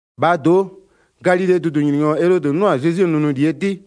1-Bhaa do'o, Galilee dʋdʋnyininyɔ Elodɩ 'nʋ-a Zezwie nʋnʋlie 'dɩ,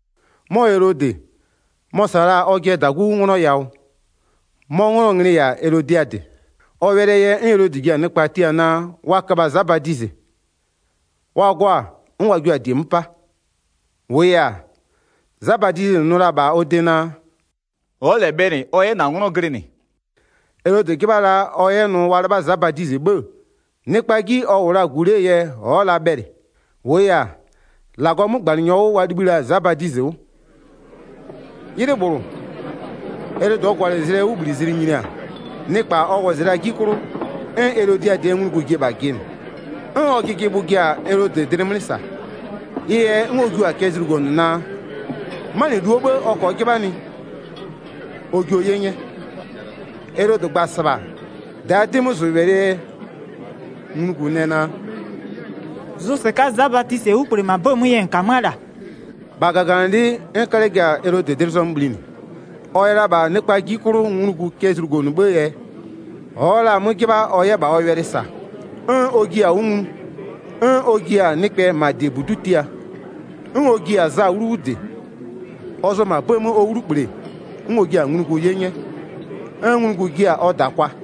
'Mɔ Elodɩ, mɔ-ɔ -sa la-a ɔjɩɛ -dagu Filipö 'nglɔ yawʋ. 'Mɔ 'nglɔɔ nglɩ-ɩ -yɛ-a Elodiadɩ. Ɔ wɛlɩɛ yɛ 'n Elodɩ ji-a nɩkpa tia naa wa köbha Za Badizɩ. Wa gɔ-a 'n wa jio-a -die 'mö 'pa. 4-Wʋʋ yɛ-a, Za Badizɩ nʋ la-a -bha ɔ de naa: “Ɔ'ɔ -lɛ bhɛlɩ ɔ 'yɛ -na 'nglɔ glɩnɩ.” Elodɩ 'jɩbha la ɔ 'yɛ nʋ wa 'lɩbha Za Badizɩ 'bhë-ë, nɩkpaa 'ji ɔ -wʋ la-a -gu 'lee yɛ ɔ'ɔ la bhɛlɩ. -Wʋʋ yɛ-a, -Lagɔɔ 'mögbanɩnyɔ 'wʋ wa libhï la-a Za Badizɩ 'wʋ. 'Ylɩ -bhlʋ, Elodɩɛ gwalɩgwalɩzlɩɛ 'wʋbhlizlɩ nyini-a, nɩkpa ɔ wɔzɩ la-aa 'ji 'klʋ, 'n Elodiadɩɛ nglugu ji-e -bha jɩnɩ, 'n ɔ jɩjɩbhʋ ji-a Elodɩ dlɩ 'mlɩ -sa. Ɩ yɛ 'n ɔ jio-a cɛ zlugonʋ naa, 'manɩluo 'bhë ɔ -kɔɔ 'jɩbhanɩ, ɔ jio 'ye 'nyɛ. Elodɩ gba-a -sɩbha, -daa 'dɩmözʋwɛlɩɛ yɛ nglugu nɛ naa: “Zʋ -sɩka'a Za Badizɩɛ 'wlukple -ma 'bëë 'mö yɛ -n -kamö'öa -la.” 9-Bha -gaganɩlɩ'ɩ 'n 'kalɛ ji-a Elodɩ dlɩ zɔmö bhlinɩ. Ɔ yɛ la -bha nɩkpaa 'ji 'klʋ nglugu cɛ zlugonʋ 'bhëë yɛ, ɔ'ɔ la-a 'mö 'jɩbha ɔ 'yɛ -bha ɔ wɛlɩ -sa. 'N ɔ jiɩ-a 'wʋ nglu. 'N ɔ ji-a nɩkpɛ -ma -diebudu'u tia, 'n ɔ ji-a Za 'wlu 'wʋ -dɩ. Ɔ zʋ-ɔ -ma 'bëë 'mö ɔ 'wlukple, 'n ɔ jia-a nglugu 'ye 'nyɛ, 'n nglugu jia-a ɔ -da kwa.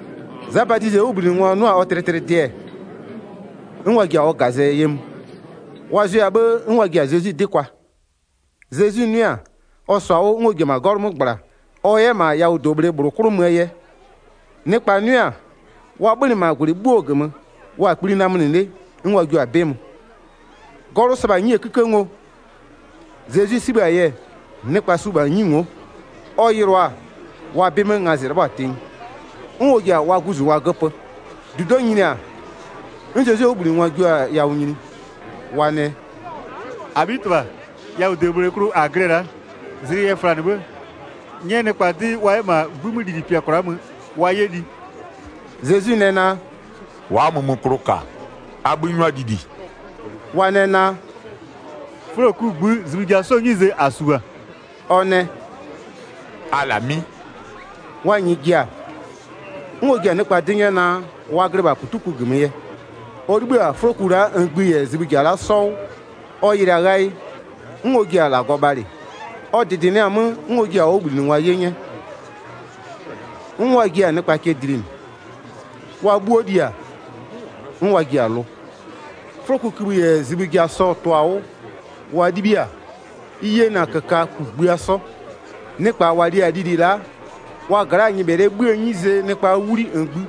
Za Badizɩɛ 'wʋbhlinɩngwa 'nʋ-a ɔ tlɩtlɩdɩ-ɛ, 'n wa ji-a ɔ -gazɛ ye mö, wa zʋɛ-a 'bhë 'n wa ji-a Zezwi 'dɩ kwa. Zezwi 'nʋɩ-a, ɔ -sɔ-a 'wʋ 'n ɔ ji-e -ma 'gɔlʋ 'mö -gbla ɔ 'yɛ -ma yawʋdobhle -bhlʋ 'klʋ möö yɛ. Nɩkpa 'nʋɩ-a, wa 'bhönɩ -ma -gwlɩ 'bhuo -gömö, wa-a kpli namönɩ 'le 'n wa jio-a 'bɩ mö. 'Gɔlʋ sɩbha-a 'nyie 'kïkë ngo, Zezwi 'sibhë-a yɛ, nɩkpa su -bha 'nyi ngo'o, ɔ yɩlʋa-a, wa 'bɩ 'mö ngazɩ 'lɩbhɔ-a tenyi. 'N ɔ ji-a wa guzungwa göpö. 15-Dudo'o nyini-a, 'n Zezwie 'wʋbhlinɩngwa jio-a yawʋ nyini. Wa nɛ: “-Abhitɩbha, yawʋdobhle klʋ -a glɩ-ɛ la'a, zlɩ yɛ flanɩ 'bhë, 'nyɛ nɩkpa 'dɩ wa 'yɛ -ma 'gbï 'mö lili -pɩa kwla'a mö, wa 'yɛ li.” Zezwi nɛ naa: “Wa'a mömöklʋ -ka. A 'bhï 'nyʋa lili.” Wa nɛ naa: “'Fʋloku -ngbï zibhï ja 'sɔɔ 'nyize -a -su -bha.” Ɔ nɛ: “A -lamɩ'ɩ.” Wa -nyɩɩ ji-a, 'n ɔ ji-a nɩkpa 'dɩ 'nyɛ naa, wa glɩ -bha -putuko -gömö yɛ. Ɔ 'libhï-a 'fʋloku la'a -ngbï -yɛ zibhï -ja la'a 'sɔ 'wʋ, ɔ yɩlɩ-a ghayɩ, 'n ɔ ji-a -Lagɔ bhalɩ, ɔ -dɩdɩnɩɩ-a 'mö 'n ɔ jiɩ-a ɔ 'wʋbhlinɩngwa 'ye 'nyɛ, 'n wa jiɩ-a nɩkpa cɛ dlinɩ. Wa 'bhuo li-a, 'n wa ji-a lʋ. 'Fʋlokukïbhï -yɛ zibhïkïbhï sɔ-ɔ tʋ-a 'wʋ wa 'libhiɩ-a, ɩ yena -köka kugbïa 'sɔ. Nɩkpa -wa li-a lili la'a wa gla'aa nyɩbhɛlɩɛ 'bhïë 'nyizee nɩkpaa 'wli -ngbï,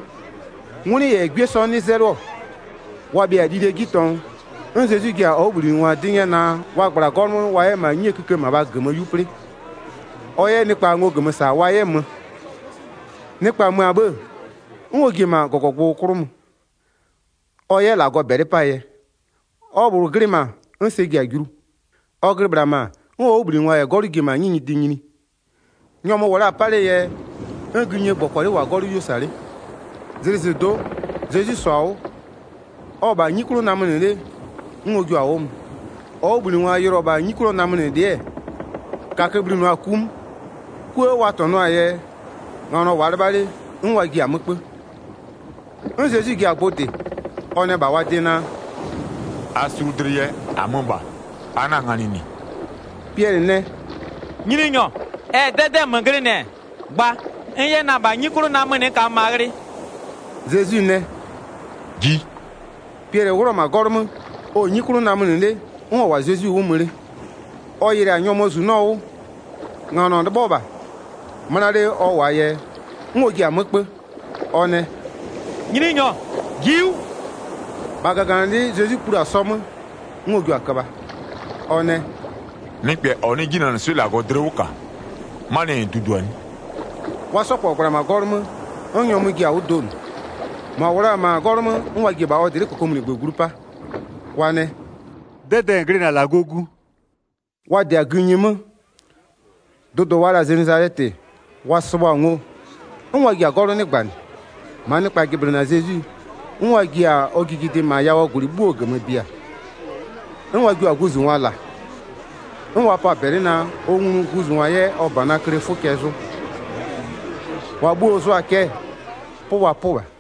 'ngwlɩ -yɛ 'gwie 'sɔ 'nɩ 'zɛlɩɔ. Wa bhɩa-a lilie 'ji tɔngʋ, 'n Zezwi ji-a ɔ 'wʋbhlinɩngwa 'dɩ 'nyɛ naa wa -gbla 'gɔlʋ 'mö wa 'yɛ -ma 'nyie kïkë -mabhaa -gömö 'yu 'plɩ, ɔ 'yɛ nɩkpa ngo -gömö -sa wa 'yɛ mö. Nɩkpa mö-a 'bhë-ë, 'n ɔ ji-e -ma -gɔgɔgbʋ 'klʋ mö, ɔ 'yɛ -Lagɔ -bɛlɩ 'paa yɛ. Ɔ -bhlʋ glɩ -ma 'n sɛ ji-a julu. Ɔ glɩ -bhla -ma 'n ɔ 'wʋbhlinɩngwa -yɛ 'gɔlʋ ji-e -ma 'nyi nyɩdɩ nyini. Nyɔmʋ -wʋ la-a 'pa 'lee yɛ, 'n gïnyie -gbɔkɔlɩ -wʋ-a 'gɔlʋ 'yuo -sa 'le. Zlɩzɩdo'o, Zezwi -sɔ-a 'wʋ, ɔ-ɔ -bha 'nyi 'klʋ namönɩ 'le 'n ɔ jua-a 'wʋ mö. Ɔ 'wʋbhlinɩngwa yɩlɩɔ-ɔ -bha 'nyi 'klʋɔ namönɩlɩ'ɩ-ɛ, -kakö-ö bhlinʋa-a ku 'mö. 'Kuë wa -tɔnʋɔ-aa yɛ nganɔ -wʋʋa 'lɩbha 'le 'n wa ji-a 'mö 'kpö. 'N Zezwi ji-a gbʋ -dɩ, ɔ nɛ -bha wa de naa: “A sulu dlɩ yɛ, -amö -bha. A 'na-a nganɩ -nɩ.” Piɛlɩ nɛ: “Nyininyɔ, ɛ -yɛ 'dɛdɛ'ɛ -nmö glɩnɩ-ɛ, gba n 'yɛ na-a -bha 'nyi 'klʋ namönɩ n -kamö -ma ghlɩ.” Zezwi nɛ: “Ji!” Piɛlɩ 'wlʋ-ɔ -ma 'gɔlʋ 'mö, ɔ-ɔ 'nyi 'klʋ namönɩ 'le, 'n ɔ -wʋ-a Zezwi 'wʋ mö 'le. Ɔ yɩlɩ-a nyɔmʋɔ -zunɔ 'wʋ, nganɔ 'lɩbhɔ -bha, 'möna 'le ɔ -wʋ-aa yɛ, 'n ɔ ji-a 'mö 'kpö, ɔ nɛ: “Nyininyɔ, ji'i 'wʋ.” 31-Bha -gaganɩlɩ'ɩ Zezwi plu-a sɔ 'mö, 'n ɔ jio-a köbha. Ɔ nɛ: “Nɩkpɛ -ɔ 'nɩ 'jinanɩswɩ'ɩ -Lagɔ dlɩ 'wʋ -ka, 'manɩɛ yɛ -n dudua 'nɩ?” Wa 'sɔ -kpɔ -gbla-a -ma 'gɔlʋ 'mö 'n nyɔmʋ ji-a 'wʋ donʋ. 33-Mʋa -wʋ la-a -ma 'gɔlʋ 'mö, 'n wa ji-e -bha ɔ dlɩ'ɩ -kokomunigbö glu 'pa, wa nɛ: “'Dɛdɛɛ -n glɩnɩ-a -Lagɔɔ Gu.” Wa -dɩ-a gïnyi 'mö-ö, dʋdʋ wa la-a Zenezalɛtɩ wa sɩbhʋ-a ngo, 'n wa ji-a 'gɔlʋ 'nɩgbanɩ. 35-Maa nɩkpa jɩblɩnɩ-a Zezwi, 'n wa ji-a ɔ jijidɩ -ma yawʋɔ -gwlɩ 'bhuo -gömö bia, 'n wa jio-a guzungwa -la. 'N wa pɔ-a -bɛlɩ naa, ɔ nglu guzungwa 'yɛ ɔ -banaa klee 'fʋ cɛ zʋ. -Wa 'bhuo-o zʋa-a cɛ, 'pʋ wa 'pʋ -bha.